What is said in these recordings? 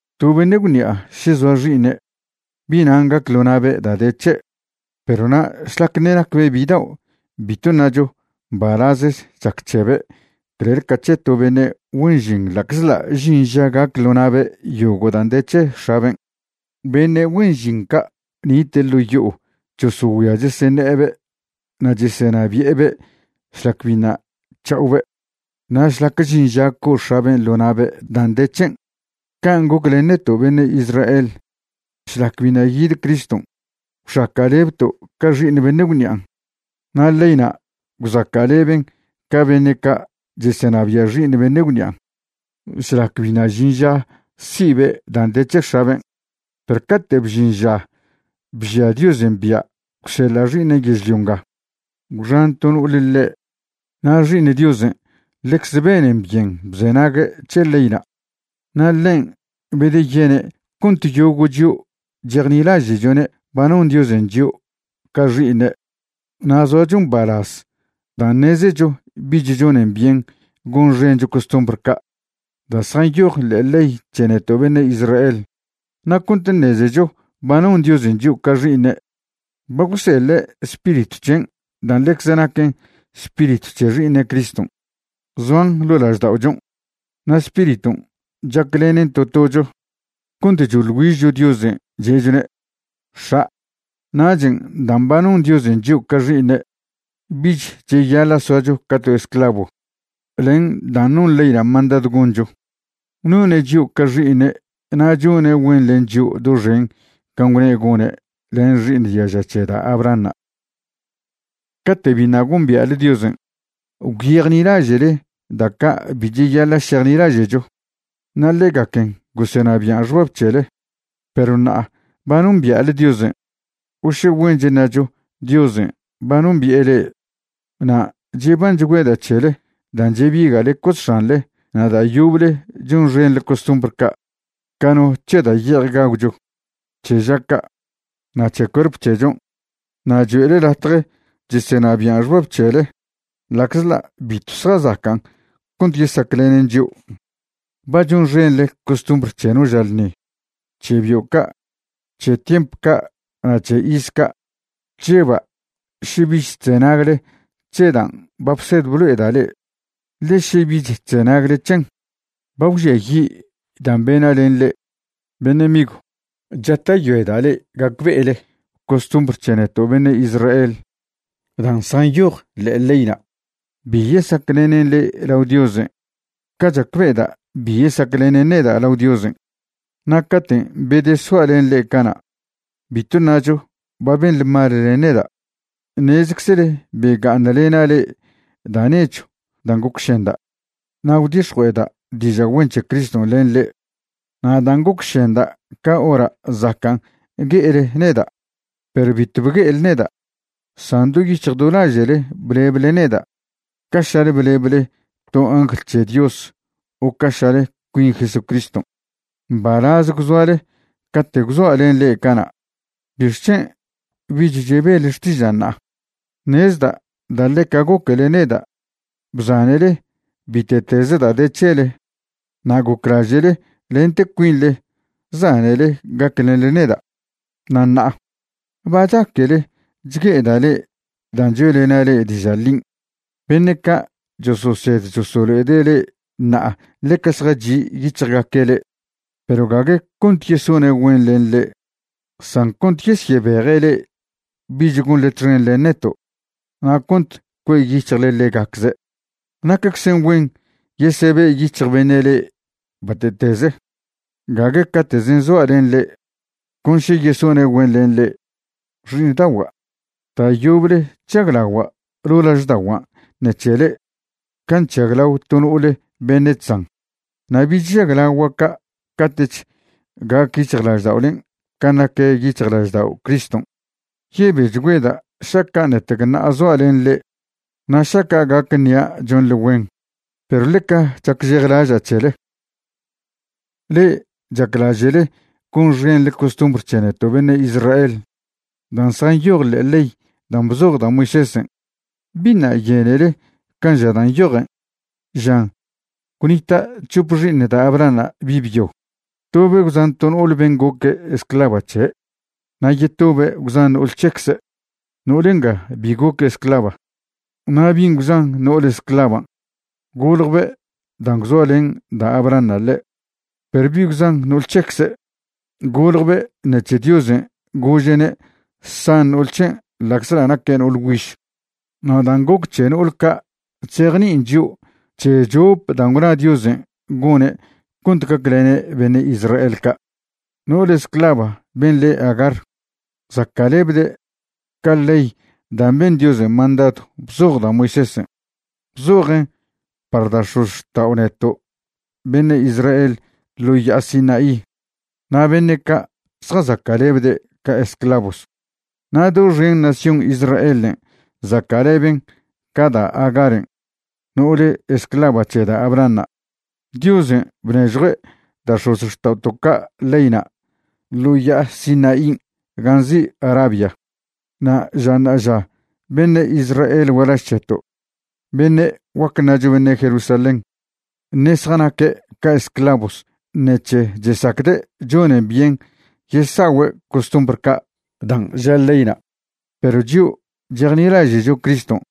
To beṉe' gwṉi'a še zoa xi'iṉe', bi'nan' gac ḻo na'be' da' de c̱he'. Perw na' šlac ṉe' nacbe' bidao' bitw ṉacho mbalazech chac c̱hebe' clel ca c̱he to beṉe' güen žin ḻa'czḻa' žin ža gac ḻo na'be' yogo' dan' de c̱he x̱aben'. Beṉe' güen žin ca' nite' ḻo' yo'o chosogüia cheseṉe'ebe' na' chesenabi'ebe' šlac biṉa' c̱ha'obe' na' šlac žin ža co'o x̱aben' ḻo na'be' dan' de c̱hen'. Can' goc len neto' beṉe' Israel šlac biṉa' yid Criston', gwxaca'lebto' ca xi'iṉ beṉe' gwṉi'an'. Na' leyna' gwzaca'leben ca beṉe' ca' chesenabia' xi'iṉ beṉe' gwṉian' šlac biṉa' žin ža si'be' dan' de c̱he x̱aben'. Perw cate' bžin ža bžia Diosen' bia' gwseḻa' Xi'iṉen' yežlio nga, gwxan to no'ole ḻe'. Na' Xi'iṉ Diosen' ḻecze benen byen bzenague' c̱he leyna'. Na' ḻen' bedeyene' cont yogo' chio' chejnilaže'chone' ba non Diosen' chio' ca xi'iṉe' na' zoacho mbalaz dan' ṉezecho bich chonen byen gonxencho costumbr ca' da' zjanyoj ḻe'e ley c̱he neto' beṉe' Israel. Na' cont ṉezecho ba non Diosen' chio' ca xi'iṉe', ba gwseḻe' Spiritw c̱hen' dan' ḻecze naquen Spiritw c̱he Xi'iṉe' Criston', zoan lo' lažda'ochon'. Na' Spiriton' chaclenen to tocho cont choḻ güižcho Diosen' che'chone': “X̱a'”. Nachen' dan' ba non Diosen' chio' ca xi'iṉe' bich cheyaḻa' soacho ca to esclavo len dan' non leyna' mandadw goncho. None' chio' ca xi'iṉe' na' chone' güen len chio' doxen can' gwne' gone' len xi'iṉ diaža c̱he da' Abrahanṉa'. Cate' biṉa' gombia'le Diosen', gwyejnilaže'le da' ca' bi cheyaḻa' šejnilaže'cho, na' ḻegaquen gosenabian' xbab c̱hele. Perw ṉa'a ba nombia'le Diosen', o še güench ṉacho Diosen' ba nombi'e le'e. Na' chebanchgüeda' c̱hele dan' chebiga'le cosx̱anḻe na' da' yoble chonxenḻe costumbr ca' ca no c̱he da' ye'ej gagwcho, c̱he ža ca', na' c̱he cuerp c̱hechon', na' cho'ele latje chesenabian' xbab c̱hele ḻa'czḻa' bitw zjazacan' cont yesaclenen chio'. Ba chonxenḻe costumbr c̱he no ža ḻṉi, c̱he bio' ca', c̱he tiemp ca' na' c̱he iz ca'. Chžeba' še bich chzenagle c̱he dan' ba bsed blo'eda' le'e, ḻe še bich chzenagle c̱hen, ba gwžiayi' dan' bena' len le'e. Beṉe' migw, chata'yoeda' le'e gacbe'ele costumbr c̱he neto' beṉe' Israel dan' zjanyoj ḻe'e leyna' bi yesaclenen le'e lao Diosen' ca chacbe'eda' bi yesaclenen neda' lao Diosen'. Na' caten' bedesoa' len le'e cana', bitw ṉacho ba benḻe mal len neda'. Ṉezeczele bega'aṉlena' le'e da' nechw dan' gocšenda' na' gwdix̱jue'eda' diža' güen c̱he Criston' len le'e. Na' dan' gocšenda' ca hora' zacan' gue'ele neda', perw bitw bgue'ele neda', san do yic̱hj do laže'le bleble neda' ca šale bleble to no angl c̱he Dios o ca šale cuin Jesucriston'. Mbalaz gwzoale cate' gwzoa' len le'e cana'. ¿Bixc̱hen' bich chebele xtižan' ṉa'a? Ṉezda' da' ḻeca goquele neda' bzanele bite'teze da' de c̱hele na' goclaže'le lente cuinḻe zanele gaclenḻe neda'. Na' ṉa'a ¿ba chaquele chgue'eda' le'e dan' choe'lena' le'e diža' ḻin'? Beṉe' ca' chososed chosolo'ede' le'e ṉa'a ḻeca zjachi' yic̱hjgaque' le'e, perw gague cont yesone' güen len le'e, san cont yesyebeje' le'e bich gonḻe txen len neto', na' cont cue' yic̱hjle ḻegacze'. Naqueczen güen yesebe' yic̱hj beṉe' le'e bate'teze, gague cate'zen' zoa' len le'e, con še yesone' güen len le'e. Xi'iṉdagua', da' yoble chžaglagua' ḻo' lažda'ogua' ṉec̱he le'e can' chžaglao to no'ole beṉe' chzan, na' bich žaglagua' ca' cate'ch gac yic̱hjlažda'olen' can' nac yic̱hjlaždao' Criston'. Yebechgüeda' šaca' ṉetec ṉa'a zoa' len le'e na' šaca' gac ṉia' chonḻe güen, perw ḻeca chacžejlaža' c̱hele. Le'e chaclaže'le gonxenḻe costumbr c̱he neto' beṉe' Israel dan' zjanyoj ḻe'e ley dan' bzoj da' Moisésen' ¿biṉa' yenele can' ža dan' nyojen? Žan gwnita' c̱hope xi'iṉ da' Abrahanṉa' bi' byo, tobe' gwzan to no'ol ben' goque' esclava c̱he' na' yetobe' gwzan no'ol c̱hecze', no'ole nga bi goque' esclava. Na' bin' gwzan no'ole esclavan' goljbe' dan' gwzoalen da' Abrahanṉa' ḻe', perw bi' gwzan no'ol c̱hecze', goljbe' ṉec̱he Diosen' gože'ne' san no'ol c̱hen' ḻa'czḻa' naque' no'ol güiž. Na' dan' goc c̱he no'ol ca' chzejni'in chio' c̱he chop dan' gwna' Diosen' gone' cont gaclene' beṉe' Israel ca'. No'ole esclava ben' le Agar zaca'lebde' ca ley dan' ben Diosen' mandadw bzoj da' Moisésen'. Bzojen' par da' x̱ozxta'o neto' beṉe' Israel ḻo ya'a Sinaí, na' beṉe' ca' zjazaca'lebde' ca esclavos. Na' doxen nación Israelen' zaca'leben ca da' Agaren' no'ole esclava c̱he da' Abrahanṉa'. Diosen' bnežjue' da' x̱ozxta'oto' ca' leyna' ḻo ya'a Sinaín' gan' nzi' Arabia, na' ža ṉa'aža beṉe' Israel gualaž c̱heto', beṉe' guac ṉacho beṉe' Jerusalén, ṉe' zjanaque' ca esclovos ṉec̱he chesacde' chonen byen yesa'ogüe' costumbr ca' dan' ža leyna'. Perw chio' chejnilaže'cho Criston'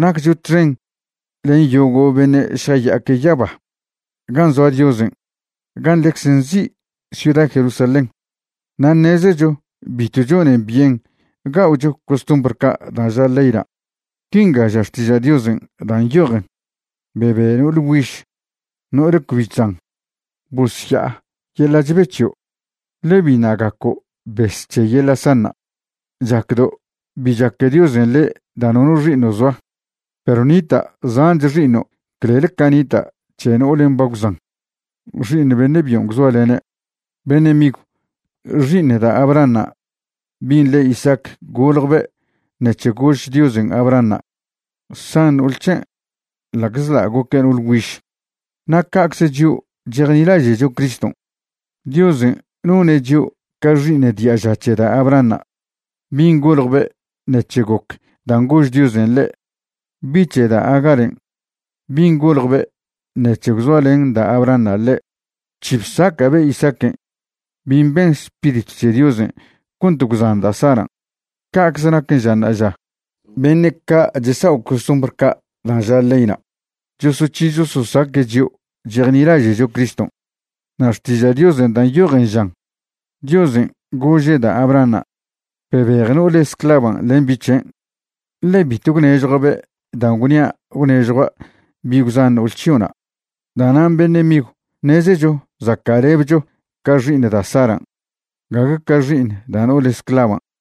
naccho txen len yogo' beṉe' šjaya'aque' yaba gan' zoa Diosen' gan' ḻecze nzi' ciuda Jerusalén. Na' ṉezecho bitw chonen byen ga'ocho costumbr ca' dan' ža leyna'. Quinga ža Xtiža' Diosen' dan' nyojen: Bebe no'ole güiž, no'ole cbi chzan, bosya'a yeḻa' chbe c̱hio', le' biṉa' gaco' bes c̱he yeḻa' sanṉa'. Chacdo' bi chaque Diosen' le' da' nono xi'iṉo' zoa, perw ṉita' zanch xi'iṉo' clel ca nita' c̱he no'olen' ba gwzan xi'iṉ beṉe' byon' gwzoalene'. Beṉe' migw, xi'iṉ da' Abrahanṉa' bin' le Isaac goljbe' ṉec̱he gož Diosen' Abrahanṉa' san no'ol c̱hen' ḻa'czḻa' goque' no'ole güiž. Na' ca'cze chio' chejnilaže'cho Criston', Diosen' none' chio' ca xi'iṉ diaža c̱he da' Abrahanṉa' bin' goljbe' ṉec̱he goc dan' gož Diosen' ḻe'. Bi' c̱he da' Agaren', bin' goljbe' ṉec̱he gwzoalen da' Abrahanṉa' ḻe', bc̱hi bsaca'be' Isaaquen' bin' ben Spiritw c̱he Diosen' cont gwzan da' Saran'. Ca'cze naquen ža ṉa'aža, beṉe' ca' chesa'o costumbr ca' dan' ža leyna' chosoc̱hi chososaque' chio' chejnilaže'cho Criston'. Na' Xtiža' Diosen' dan' nyojen žan Diosen' gože' da' Abrahanṉa': “Bebej no'ole esclavan' len bi' c̱hen', ḻe bitw gwnežjua'be' dan' gwnia' gwnežjua' bi' gwzan no'ol c̱hio'na'.” Da'nan' beṉe' migw, ṉezecho zaca'lebcho ca xi'iṉ da' Saran', gague ca xi'iṉ da' no'ole esclavan'.